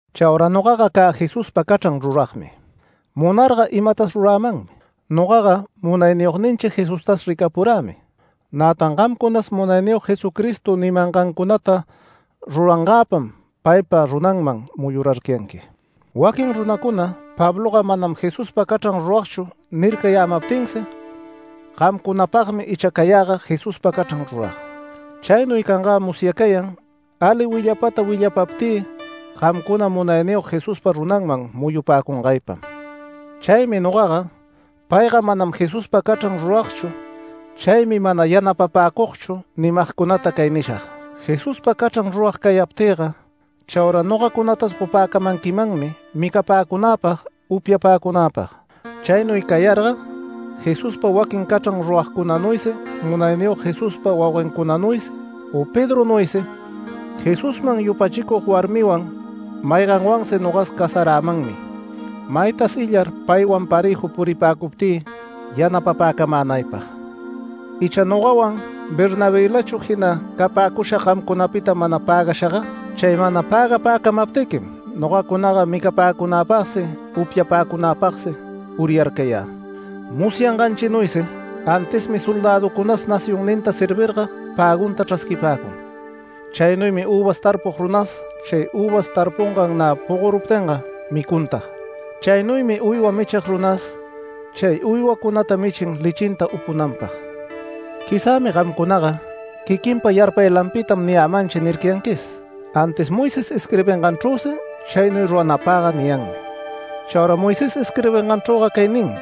Chaura nogaga cä Jesuspa cachran ruragmi, munarga imatas rurämanmi. Nogaga Munayniyogninchi Jesustas ricapurämi. Nätan gamcunas Munayniyog Jesucristo nimangancunata rurangäpam paypa runanman muyurarcayanqui. Waquin runacuna “Pabloga manam Jesuspa cachran ruragchu” nircayämaptinsi, gamcunapagmi icha cayäga Jesuspa cachran rurag. Chaynuy cangä musyacayan ali willapata willapaptï gamcuna Munayniyog Jesuspa runanman muyupäcungaypam. Chaymi nogaga “Payga manam Jesuspa cachran ruragchu, chaymi mana yanapapäcugchu” nimagcunata cay nishag: Jesuspa cachran rurag cayaptïga chaura nogacunatas gopäcamanquimanmi micapäcunäpag upyapäcunäpag. Chaynuy cayarga, Jesuspa waquin cachran ruragcunanuysi, Munayniyog Jesuspa wauguencunanuysi u Pedronuysi, Jesusman yupachicug warmiwan mayganwansi nogas casarämanmi, maytas illar paywan parëju puripäcuptï yanapapäcamänaypag. ¿Icha nogawan Bernabëlachu jina capäcushag gamcunapita mana pägashaga? Chay mana pägapäcamaptiquim nogacunaga micapäcunäpagsi upyapäcunapagsi uryarcayä. Musyanganchinuysi antismi soldäducunas nacionninta servirga pägunta chrasquipäcun. Chaynuymi üvas tarpug runas chay üvas tarpungan nä pogoruptinga micuntag. Chaynuymi uywa michig runas chay uywacunata michin lechinta upunanpag. Quizämi gamcunaga “Quiquinpa yarpaylanpitam niyämanchi” nircayanquis, antis Moisés isquirbinganchrüsi chaynuy ruranapagga niyanmi. Chaura Moisés isquirbinganchrüga cay ninmi: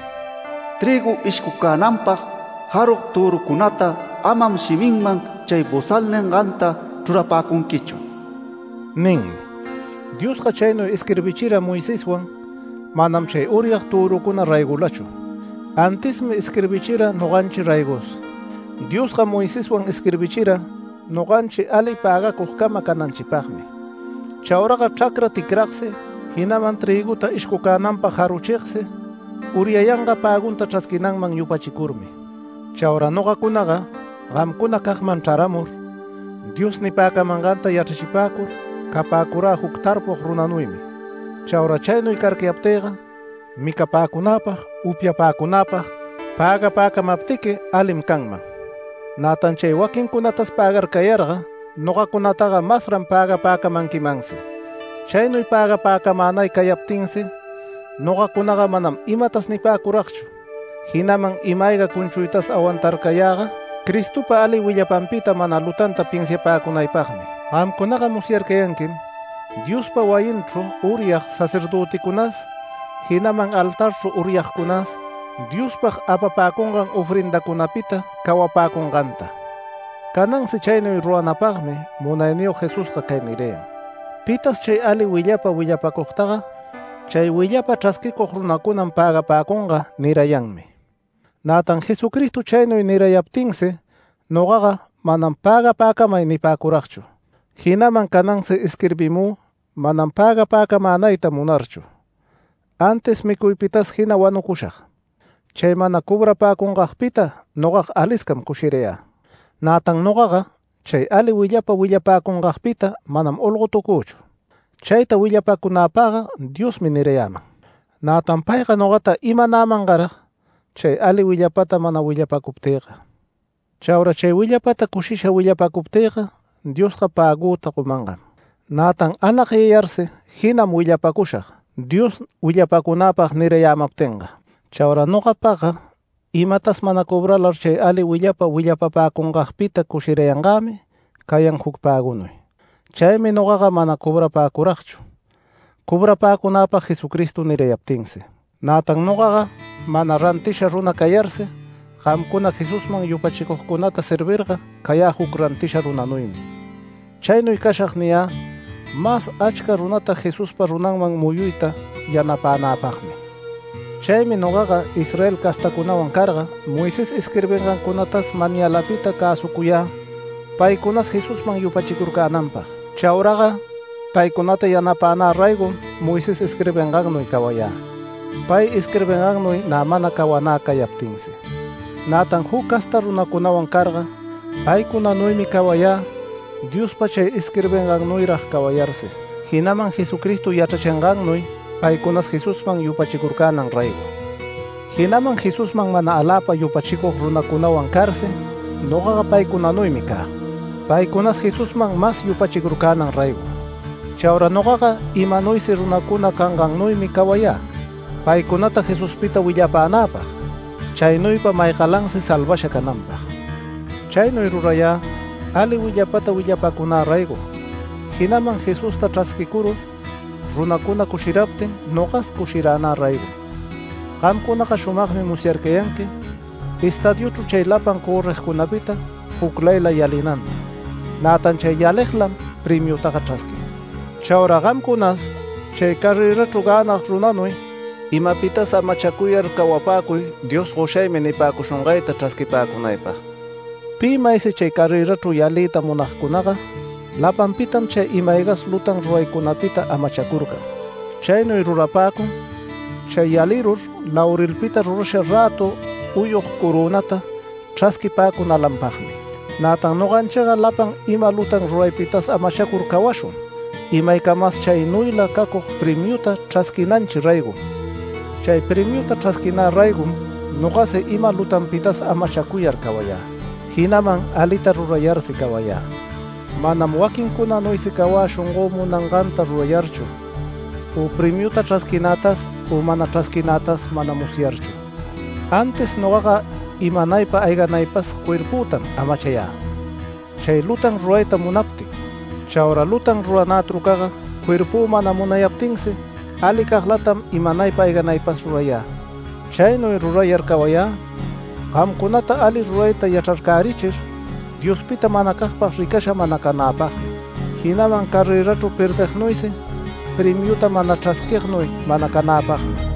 “Trïgu ishcucänanpag jarug törucunata amam shiminman chay ‘bosal’ ninganta chrurapunquichu” ninmi. Diosga chaynuy isquirbichira Moiseswan manam chay uryag törucuna raygolachu. Antismi isquirbichira noganchi raygos, Diosga Moiseswan isquirbichira noganchi ali pägacugcama cananchipagmi. Chauraga chracra ticragsi, jinaman trïguta ishcucänanpag jaruchigsi uryayanga pägunta chrasquinanman yupachicurmi. Chaura nogacunaga gamcunacagman chraramur Dios nipäcamanganta yachrachipäcur capäcurä juc tarpug runanuymi. Chaura chaynuy carcayaptïga micapäcunäpag, upyapäcunäpag, pägapäcamaptiqui alim canman. Nätan chay waquincunatas pägarcayarga, nogacunataga masran pägapäcamanquimansi. Chaynuy pägapäcamänay cayaptinsi nogacunaga manam imatas nipäcuragchu, jinaman ima-ayga cunchuytas awantarcayäga, Cristopa ali willapanpita mana lutanta pinsiapäcunaypagmi. Gamcunaga musyarcayanquim Diospa wayinchru uryag sacerdöticunas, jinaman altarchru uryagcunas, Diospag apapäcungan ofrendacunapita cawapäcunganta. Canansi chaynuy ruranapagmi Munayniyog Jesusga cay nirayan: “Pitas chay ali willapa willapacugtaga, chay willapa chrasquicug runacunam pägapäcunga” nirayanmi. Nätan Jesucristo chaynuy nirayaptinsi nogaga “Manam pägapäcamay” nipäcuragchu. Jinaman canansi isquirbimü manam pägapäcamänayta munarchu, antis micuypitas jina wanucushag. Chay mana cobrapäcungagpita nogaga aliscam cushirayä. Nätan nogaga chay ali willapa willapäcungagpita manam olgotucüchu. Chayta willapacunäpagga Diosmi nirayäman. Nätan payga nogata imanämangarag chay ali willapata mana willapacuptïga. Chaura chay willapata cushisha willapacuptïga Diosga päguta gomangam. Nätan anagyayarsi jinam willapacushag Dios willapäcunäpag nirayämaptinga. Chaura nogapagga imatas mana cobralar chay ali willapa willapapäcungagpita cushirayangämi cayan juc pägunuy. Chaymi nogaga mana cobrapäcuragchu, cobrapäcunagpag Jesucristo nirayaptinsi. Nätan nogaga mana rantisha runa cayarsi, gamcuna Jesusman yupachicugcunata servirga cayä juc rantisha runanuymi. Chaynuy cashag niyä mas achca runata Jesuspa runanman muyuyta yanapänäpagmi. Chaymi nogaga Israel castacunawan carga Moisés isquirbingancunatas manyalapita cäsucuyä paycunas Jesusman yupachicurcänanpag. Chauraga paycunata yanapänä raygom Moisés isquirbingannuy cawayä, pay isquirbingannuy nä mana cawanä cayaptinsi. Nätan juc casta runacunawan carga paycunanuymi cawayä Diospa chay isquirbingannuyrag cawayarsi, jinaman Jesucristo yachrachingannuy paycunas Jesusman yupachicurcänan raygo. Jinaman Jesusman mana aläpa yupachicug runacunawan carsi nogaga paycunanuymi cä, paycunas Jesusman mas yupachicurcänan raygo. Chaura nogaga imanuysi runacuna cangannuymi cawayä paycunata Jesuspita willapänäpag, chaynuypa maygalansi salvasha cananpag. Chaynuy rurayä ali willapata willapacunä raygom, jinaman Jesusta chrasquicurur runacuna cushiraptin, nogas cushiranä raygom. Gamcunaga shumagmi musyarcayanqui estadiuchru chay lapan cörrigcunapita juclayla yalinanta. Nätan chay yaliglam premiutaga chrasquin. Chaura gamcunas chay carrërachru gänag runanuy imapitas amachacuyar cawapäcuy Dios “Goshaymi” nipäcushungayta chrasquipäcunaypag. Pi maysi chay carrërachru yaliyta munagcunaga, lapanpitam chay ima-aygas lutan ruraycunapita amachacurcan. Chaynuy rurapäcun chay yalirur laurelpita rurasha rätu uyug corönata chrasquipäcunalanpagmi. Nätan noganchiga lapan ima lutan ruraypitas amachacur cawashun imaycamas chaynuyla cacug premiuta chrasquinanchi raygom. Chay premiuta chrasquinä raygom nogasi ima lutanpitas amachacuyar cawayä, jinaman alita rurayarsi cawayä. Manam waquincunanuysi cawä shongö munanganta rurayarchu u premiuta chrasquinätas u mana chrasquinätas mana musyarchu. Antis nogaga imanaypa ayganaypas cuerpütam amachayä chay lutan rurayta munaptin. Chaura lutan ruranä trucaga cuerpü mana munayaptinsi alicaglatam imanaypa ayganaypas rurayä. Chaynuy rurayar cawayä gamcunata ali rurayta yachrarcärichir Diospita manacagpag ricasha mana canäpagmi, jinaman carrërachru perdignuysi premiuta mana chrasquignuy mana canäpagmi.